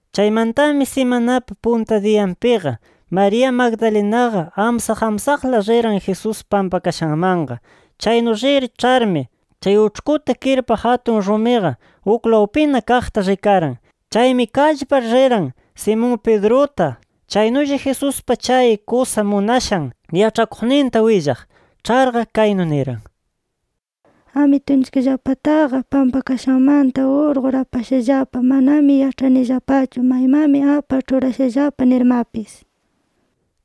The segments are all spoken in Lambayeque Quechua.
Chaymantami simanapa punta diyanpiqa María Magdalenaqa amsaq amsaqla riran Jesús pampakashanmanqa. Chaynu rir ĉharmi, chay uĉhkuta kirpaq atun rumiqa uklawpina kaqta rikaran. Chaymi kallpar riran, Simón Pedruta, chaynulla Jesuspa chay kusa munashan yaĉhakuqninta willaq. Ĉharqa, kaynu niran: —¡Amitunchikllapataqa pampakashanmanta urqur apashallapa! ¡Manami yaĉhayanillapachu maymanmi apar ĉhurashallapa nirmapis!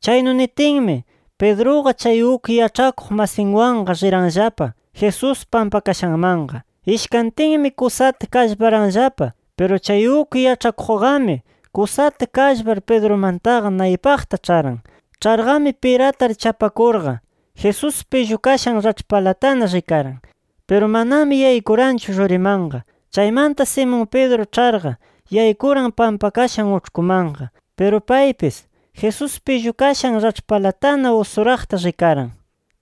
Chaynu nitinmi, Pedruqa chay uk yaĉhakuq masinwanqa riranllapa Jesús pampakashanmanqa. Ishkantinmi kusata kallparanllapa. Piru chay uk yaĉhakuqqami kusata kallpar Pedrumantaqa naypaqta ĉharan. Ĉharqami piratar chapakurqa Jesús pillukashan raĉhpalatana rikaran. Piru manami yaykuranchu rurimanqa. Chaymanta Simón Pedro ĉharqa, yaykuran pampakashan uĉhkumanqa. Piru paypis, Jesús pillukashan raĉhpalatana usuraqta rikaran.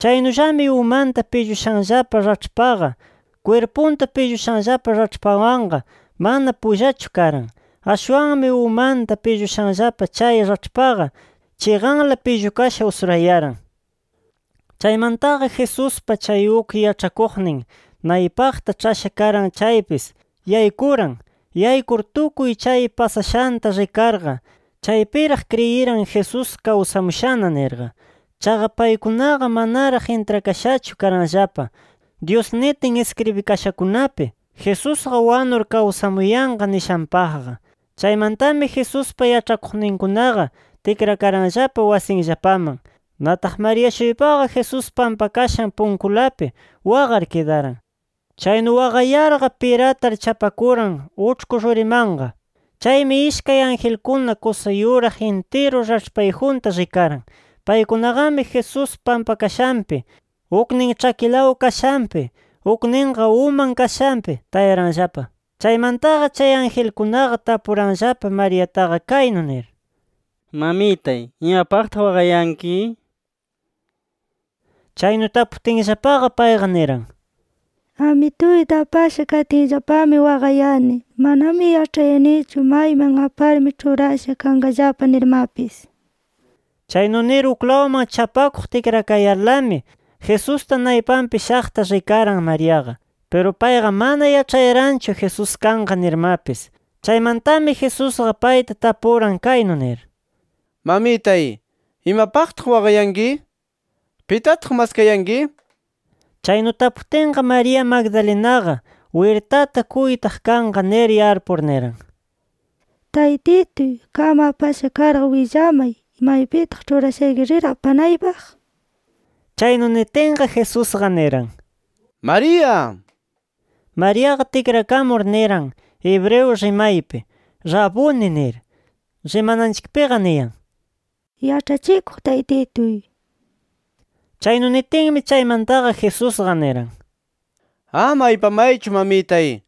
Chaynullami umanta pillushanllapa raĉhpaqa, kwirpunta pillushanllapa raĉhpawanqa mana pullachu karan. Ashwanmi umanta pillushanllapa chay raĉhpaqa, chiqanla pillukasha usurayaran. Chaymantaqa, Jesuspa chay uk yaĉhakuqnin naypaqta ĉhasha karan chaypis, yaykuran. Yaykur tukuy chay pasashanta rikarqa, chaypiraq kriyiran Jesús kawsamushana nirqa. Chaqa paykunaqa manaraq intrakashachu karanllapa, Dyus nitin iskribikashakunapi Jesusqa wanur kawsamuyanqa nishanpaqqa. Chaymantami Jesuspa yaĉhakuqninkunaqa tikrakaranllapa wasinllapaman. Nataq María-shuypaqa Jesús pampakashan punkulapi waqar kidaran. Chaynu waqayarqa, piratar chapakuran uĉhku rurimanqa. Chaymi ishkay angelkuna kusa yuraq intiru raĉhpayjunta rikaran. Paykunaqami Jesús pampakashanpi, uknin ĉhakinlaw kashanpi, ukninqa uman kashanpi tayaranllapa. Chaymantaqa chay angelkunaqa tapuranllapa Mariataqa kaynu nir: —Mamitay, ¿imapaqtaq waqayanki? nir. Chaynu taputinllapaqa, payqa niran: —Amituyta apasha katinllapami waqayani. Manami yaĉhayanichu mayman aparmi ĉhurasha kanqallapa nirmapis. Chaynu nir uklawman chapakuq tikrakayarlami, Jesusta naypanpi shaqta rikaran Mariaqa. Piru payqa mana yaĉhayaranchu Jesús kanqa nirmapis. Chaymantami Jesusqa payta tapuran kaynu nir: —Mamitay, ¿imapaqtaq waqayanki? ¿Pitataq maskayanki? Chaynu taputinqa, María Magdalenaqa, wirtata kuytaq kanqa nir yarpur, niran: —Taytituy qam apasha karqa willamay, ¿maypitaq ĉhurashayki rir apanaypaq? nir. Chaynu nitinqa, Jesusqa niran: —¡María! nir Mariaqa tikrakamur niran hebreo rimaypi: —¡Raboni! nir. (Rimananchikpiqa niyan “Yaĉhachikuq Taytituy”). Chaynu nitinmi chaymantaqa, Jesusqa niran: —Ama aypamaychu mamitay.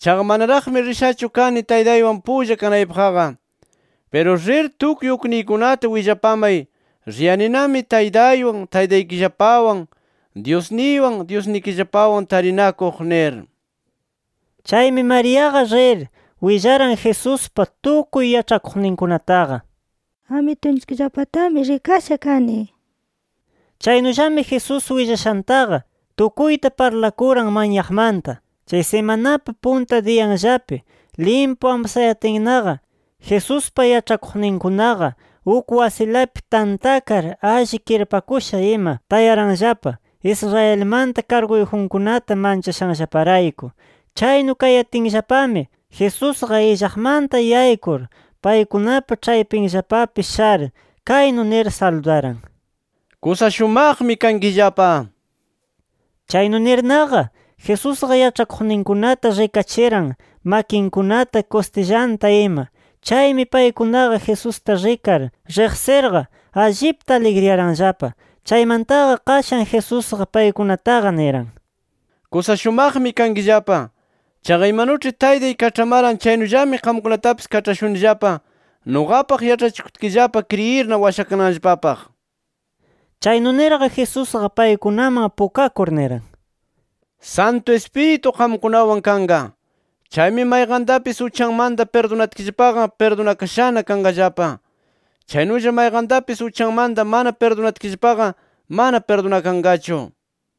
Chaqa manaraqmi rishachu kani Taytaywan pulla kanaypaqqa. Piru rir, tukuy ukniykunata willapamay, riyaninami Taytaywan, Taytaykillapawan, Dyusniywan, Dyusnikillapawan tarinakuq nir. Chaymi Mariaqa rir, willaran Jesuspa tukuy yaĉhakuqninkunataqa: “Amitunchikllapatami rikasha kani” nir ima. Chaynullami Jesús willashantaqa tukuyta parlakuran manyaqmanta. Chay simanapa punta diyanllapi, limpu amsayatinnaqa Jesuspa yaĉhakuqninkunaqa uk wasilapi tantakar alli kirpakusha ima tayaranllapa, Israelmanta karguyjunkunata manchashanllaparayku. Chaynu kayatinllapami, Jesusqa illaqmanta yaykur, paykunapa ĉhaypinllapapi shar, kaynu nir saludaran: —¡Kusa shumaqmi kankillapa! nir. Chaynu nirnaqa, Jesusqa yaĉhakuqninkunata rikachiran makinkunata, kustillanta ima. Chaymi paykunaqa Jesusta rikar riqsirqa, allipta aligriyaranllapa. Chaymantaqa qashan Jesusqa paykunataqa niran: —¡Kusa shumaqmi kankillapa! Chaqa imanuĉhi Taytay kaĉhamaran chaynullami qamkunatapis kaĉhashunillapa, nuqapaq yaĉhachikutkillapa kriyirna washakananllapapaq nir. Chaynu nirqa, Jesusqa paykunaman pukakur, niran: —Santu Ispiritu qamkunawan kanqa. Chaymi mayqantapis uchanmanta pirdunatkillapaqa pirdunakashana kanqallapa. Chaynulla mayqantapis uchanmanta mana pirdunatkillapaqa, mana pirdunakanqachu nir.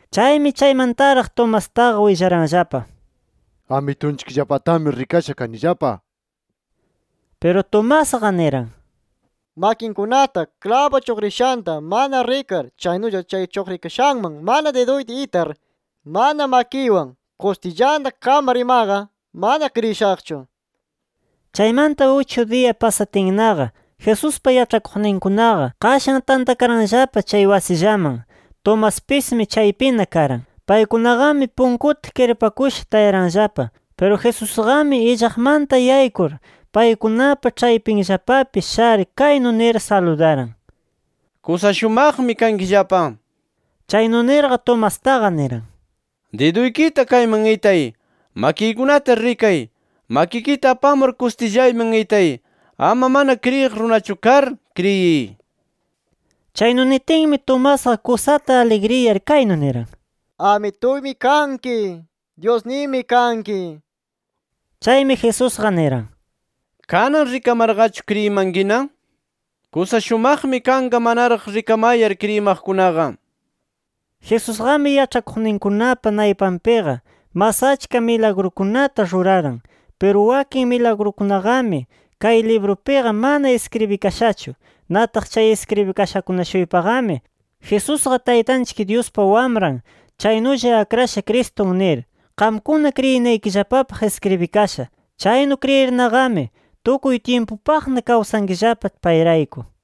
Chaymi chaymantaraq Tomastaqa willaranllapa: —Amitunchikllapatami rikasha kanillapa, nir. Piru Tomasqa niran: —Makinkunata klabu chuqrishanta mana rikar, chaynulla chay chuqrikashanman mana diduyta itar, mana makiywan kustillanta kamar imaqa, mana kriyishaqchu nir. Chaymanta uchu diya pasatinnaqa, Jesuspa yaĉhakuqninkunaqa qashan tantakaranllapa chay wasillaman. Tomaspismi chaypina karan. Paykunaqami punkuta kirpakusha tayaranllapa. Piru Jesusqami illaqmanta yaykur paykunapa ĉhaypinllapapi shar kaynu nir saludaran: —¡Kusa shumaqmi kankillapa! nir. Chaynu nirqa, Tomastaqa niran: —Diduykita kayman itay, makiykunata rikay, makikita apamur kustillayman itay. Ama mana kriyiq runachu kar, ¡kriyiy! nir. Chaynu nitinmi, Tomasqa kusata aligriyar kaynu niran: —¡Amituymi kanki; Dyusniymi kanki! nir. Chaymi Jesusqa niran: —¿Kanan rikamarqachu kriyimankina? ¡Kusa shumaqmi kanqa manaraq rikamayar, kriyimaqkunaqa! nir. Jesusqami yaĉhakuqninkunapa naypanpiqa mas achka milagrukunata ruraran. Piru wakin milagrukunaqami kay librupiqa mana iskribikashachu. Nataq chay iskribikashakuna-shuypaqami, Jesusqa Taytanchik Dyuspa Wamran chaynulla Akrashan Cristun nir, qamkuna kriyinaykillapapaq iskribikasha. Chaynu kriyirnaqami tukuy tyimpupaqna kawsankillapa payrayku.